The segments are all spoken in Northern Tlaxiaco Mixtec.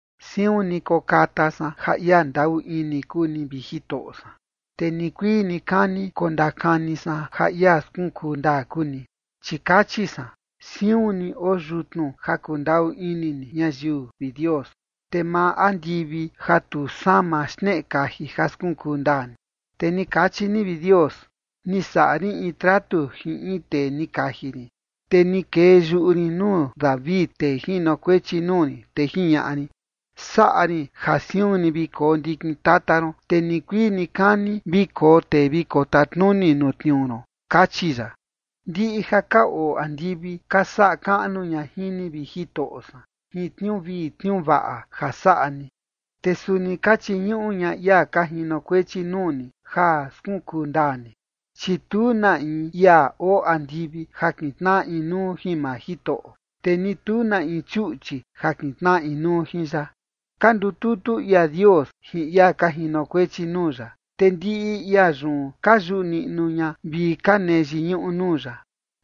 Siun ni kokata san ja ia ndaꞌu ini kuu ni, vi Jitoꞌo san, te nikuii nikani kondakani san ja ia skunkuu ndaa kuu ni. Chi kachi san: “Siun ni oo yutnu ja kundaꞌu ini ni ñayiu, vi Dios, te maa andivi ja tu sama, xneꞌe kaji ja skunkuu ndaa ni”. Te ni kachi ni, vi Dios: “Ni saꞌa rin in tratu jin in tee ni kaji rin, te ni kee yuꞌu rin nuu David, tee jinokuechi nuu rin, te jiñaꞌa rin: Saꞌa rin ja siun ni vi koo ndikin tata ron, te nikuii nikani vi koo tee vi kotatnuni nuu tniuu ron”, kachi ya. Ndiꞌi ja ka oo andivi ka saꞌa kaꞌnu ña jin ni, vi Jitoꞌo san, jin tniuu vii tniuu vaꞌa ja saꞌa ni, te suni ka chiñuꞌu ña ia ka jinokuechi nuu ni ja skunkuu ndaa ni. Chi tu na in ia oo andivi ja kintnaꞌa inuu jin maa Jitoꞌo, te ni tu na in chuꞌchi ja kintnaꞌa inuu jin ya. Ka ndututu ia Dios jin ia ka jinokuechi nuu ya, te ndiꞌi ia yun ka yuꞌu niꞌnu ña vi ka nee yiñuꞌu nuu ya,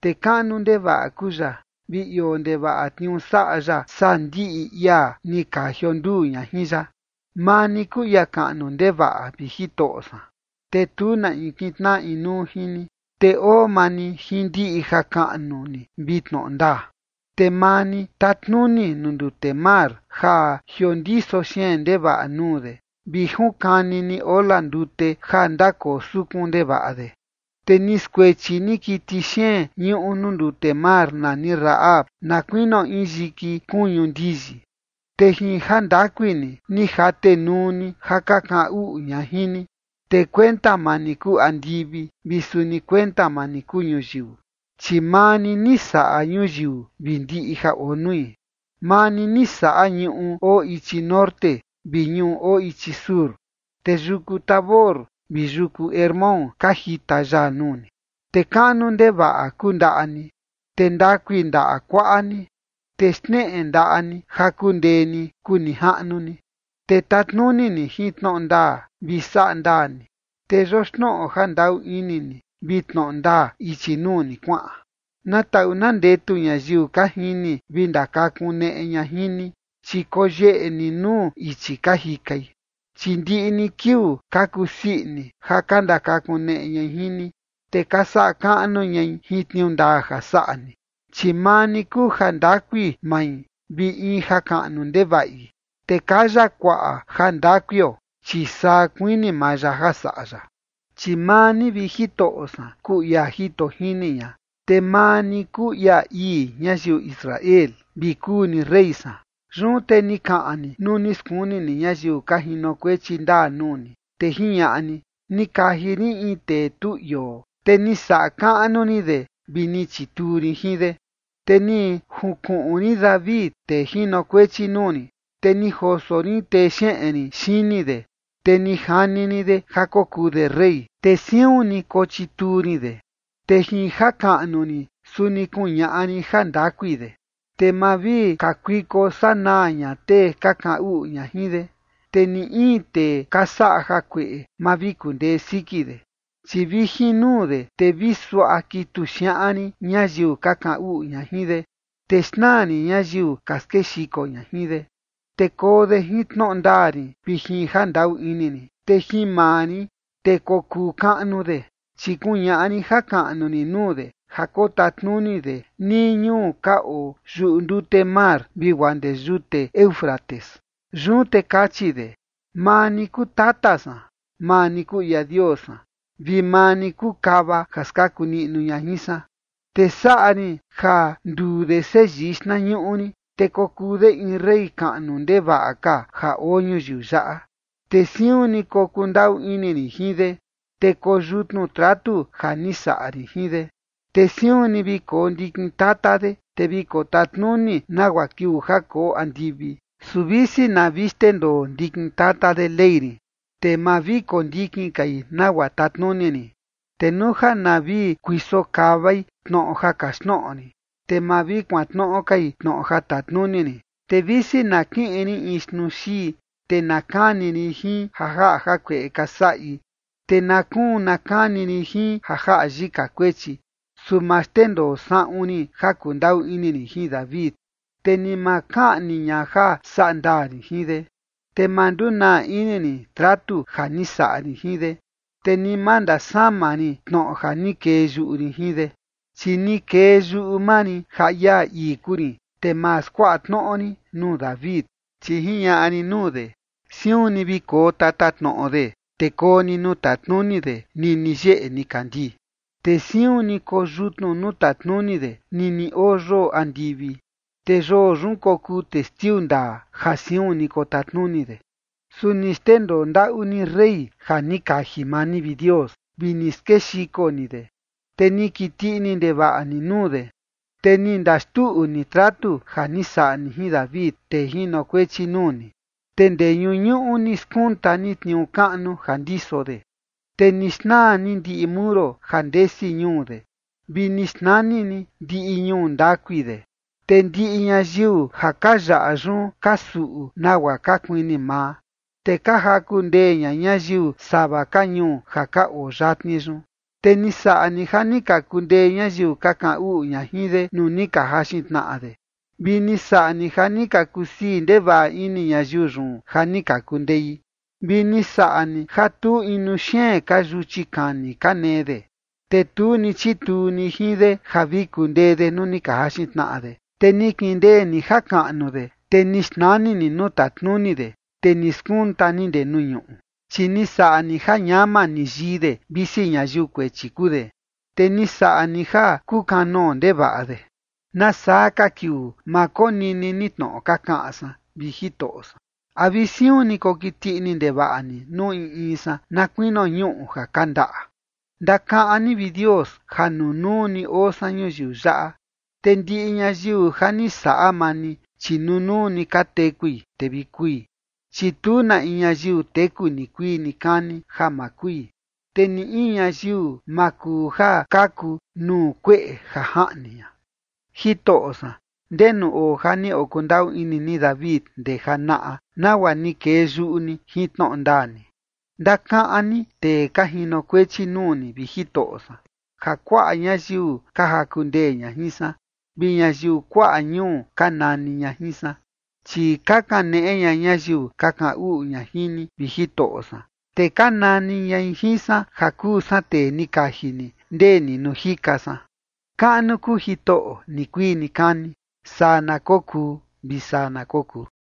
te kaꞌnu ndevaꞌa kuu ya vi ioo ndevaꞌa tniuu saꞌa ya saa ndiꞌi ia ni ka jionduu ña jin ya. Maa ni kuu ia kaꞌnu ndevaꞌa, vi Jitoꞌo san, te tu na in kintnaꞌa inuu jin ni, te oo maa ni jin ndiꞌi jakaꞌnu ni vi tnoꞌo ndaa. Te maa ni tatnuni nuu ndute mar ja jiondiso xeen ndevaꞌa nuu de, vi junkani ni ola ndute ja ndakoo sukun ndevaꞌa de. Te ni skuechi ni kiti xeen ñuꞌu nuu ndute mar nani Rahab na kuinio in yiki kuñu ndiyi, te jin jandakui ni, ni jatenuu ni ja ka kaꞌan uꞌu ña jin ni. Te kuenta maa ni kuu andivi vi suni kuenta maa ni kuu ñuyiu, chi maa ni ni saꞌa ñuyiu vi ndiꞌi ja oo nui. Maa ni, ni saꞌa ñuꞌu oo ichi norte vi ñuꞌu oo ichi sur, te yuku Tabor vi yuku Hermón ka jita yaa nuu ni. Te kaꞌnu ndevaꞌa kuu ndaꞌa ni, te ndakui ndaꞌa kuaꞌa ni, te xneꞌe ndaꞌa ni ja kundee ni, kuu nijaꞌnu ni. Te tatnuni ni jin tnoꞌo ndaa vi saꞌa ndaa ni, te yoxnoꞌo ja ndaꞌu ini ni vi tnoꞌo ndaa ichi nuu ni kuaꞌan. Na taꞌu na ndetu ñayiu ka jini vi ndakakuneꞌe ña jin ni, chi koyeꞌe ni nuu ichi ka jikai. Chi ndiꞌi ni kiuu ka kusii ini ja ka ndakakuneꞌe ñai jin ni, te ka saꞌa kaꞌnu ñai jin tniuu ndaa ja saꞌa ni. Chi maa ni kuu jandakui mai vi in jakaꞌnu ndevaꞌi, te kaya kuaꞌa jandakuio, chi saa kuini maa ya ja saꞌa ya. Chi maa ni, vi Jitoꞌo san, kuu ia jito jini ña, te maa ni kuu ia ii ñayiu Israel, vi kuu ni rey san. Yun te ni kaꞌan ni nuu ni skuni ni ñayiu ka jinokuechi ndaa nuu ni, te jiñaꞌa ni: “Ni kaji rin in tee tu ioo, te ni saꞌa kaꞌnu rin de vi ni chituu rin jin de. Te ni junkuꞌun rin David, tee jinokuechi nuu rin, te ni joso rin texeꞌen rin xini de, te ni jani rin de ja kokuu de rey. Te siun ni kochituu rin de, te jin jakaꞌnu rin, suni kuñaꞌa rin jandakui de. Te ma vi kakuiko sanaa ña tee ka kaꞌan uꞌu ña jin de, te ni in tee ka saꞌa jakueꞌe ma vi kundee siki de. Chi vi jin nuu de, te vi suaꞌa kitu xiaꞌan rin ñayiu ka kaꞌan uꞌu ña jin de, te xnaa rin ñayiu ka skexiko ña jin de. Te koo de jin tnoꞌo ndaa rin vi jin ja ndaꞌu ini rin, te jin maa rin, te kokuu kaꞌnu de. Chi kuñaꞌa rin jakaꞌnu rin nuu de ja kotatnuni de nii ñuu ka oo yuꞌu ndute mar, vi guaa ndee yute Éufrates.” Yun te kachi de: “Maa ni kuu tata san, maa ni kuu ia Dios san, vi maa ni kuu kava ja skaku niꞌnu ña jin san”. “Te saꞌa rin ja nduu de seyii xtnañuꞌu rin, te kokuu de in rey kaꞌnu ndevaꞌa ka ja oo ñuyiu yaꞌa. Te siun ni kokundaꞌu ini rin jin de, te koo yutnu tratu ja ni saꞌa rin jin de. Te siun ni vi koo ndikin tata de, te vi kotatnuni nagua kiuu ja koo andivi. ’Su visi na vi xndendoo ndikin tata de ley rin, te ma vi kondikin kai nagua tatnuni rin, te nuu ja na vi kuiso kavai tnoꞌo ja kaxtnoꞌo rin, te ma vi kuantnoꞌo kai tnoꞌo ja tatnuni rin, te visi na kiꞌin rin in xtnuu xii, te na kani rin jin ja jaꞌa jakueꞌe ka saꞌi, te na kuun na kani rin jin ja jaꞌa yika kuechi, su ma xndendoo saꞌun rin ja kundaꞌu ini rin jin David, te ni ma kaꞌni ña ja saꞌa ndaa rin jin de. Te ma ndunaa ini rin tratu ja ni saꞌa rin jin de, te ni ma ndasama rin tnoꞌo ja ni kee yuꞌu rin jin de. Chi ni kee yuꞌu maa rin ja ia ii kuu rin, te ma skuaꞌa tnoꞌo rin nuu David. Chi jiñaꞌa rin nuu de, siun ni vi koo tatatnoꞌo de, te koo ni nuu tatnuni de nini yeꞌe nikandii. Te siun ni koyutnu nuu tatnuni de nini oo yoo andivi, te yoo yun kokuu testiu ndaa ja siun ni kotatnuni de.” Su ni xndendoo ndaꞌu ni rey ja ni kaji maa ni, vi Dios, vi ni skexiko ni de, te ni kiti ini ndevaꞌa ni nuu de. Te ni ndaxtuꞌu ni tratu ja ni saꞌa ni jin David, tee jinokuechi nuu ni, te ndee ñuñuꞌu ni skunta ni tniuu kaꞌnu ja ndiso de. Te ni xnaa ni ndiꞌi muro ja ndesi ñuu de, vi ni xnani ni ndiꞌi ñuu ndakui de. Te ndiꞌi ñayiu ja ka yaꞌa yun ka suꞌu nagua ka kuini maa, te ka jaku ndee ña ñayiu sava ka ñuu ja ka oo yatni yun. Te ni saꞌa ni ja ni ka kundee ñayiu ka kaꞌan uꞌu ña jin de nuu ni ka jaxin tnaꞌa de, vi ni saꞌa ni ja ka kusii ndevaꞌa ini ñayiu yun ja ni ka kundei. Vi ni saꞌa ni ja tu inu xeen ka yuchi kani ka nee de, te tu ni chituu ni jin de ja vi kundee de nuu ni ka jaxin tnaꞌa de. Te ni kindee ni jakaꞌnu de, te ni xnani ni nuu tatnuni de, te ni skunta ni ndee nuu ñuꞌu. Chi ni saꞌa ni ja ñama ni yii de, visi ñayiu kuechi kuu de, te ni saꞌa ni ja kukanoo ndevaꞌa de. ¿Nasaa ka kiuu ma konini ni tnoꞌo ka kaꞌan san, vi Jitoꞌo san? ¿A vi siun ni kokiti ini ndevaꞌa ni nuu in in san na kuinio ñuꞌu ja kandaꞌa? Ndakaꞌan ni, vi Dios, ja nunuu ni oo san ñuyiu yaꞌa, te ndiꞌi ñayiu ja ni saꞌa maa ni, chi nunuu ni ka tekui, te vi kui. Chi tu na in ñayiu teku nikuii nikani ja ma kui, te ni in ñayiu ma kuu ja kaku nuu kueꞌe ja jaꞌni ña. Jitoꞌo san, ¿ndenu oo ja ni okundaꞌu ini ni David ndee janaꞌa, nagua ni kee yuꞌu ni jin tnoꞌo ndaa ni? Ndakaꞌan ni tee ka jinokuechi nuu ni, vi Jitoꞌo san, ja kuaꞌa ñayiu ka jaku ndee ña jin san, vi ñayiu kuaꞌa ñuu ka nani ña jin san. Chi ka kaneꞌe ña ñayiu ka kaꞌan uꞌu ña jin ni, vi Jitoꞌo san, te ka nani ñai jin san ja kuu san tee ni kaji ni, ndee ni nuu jika san. ¡Kaꞌnu kuu Jitoꞌo nikuii nikani! Saa na kokuu vi saa na kokuu.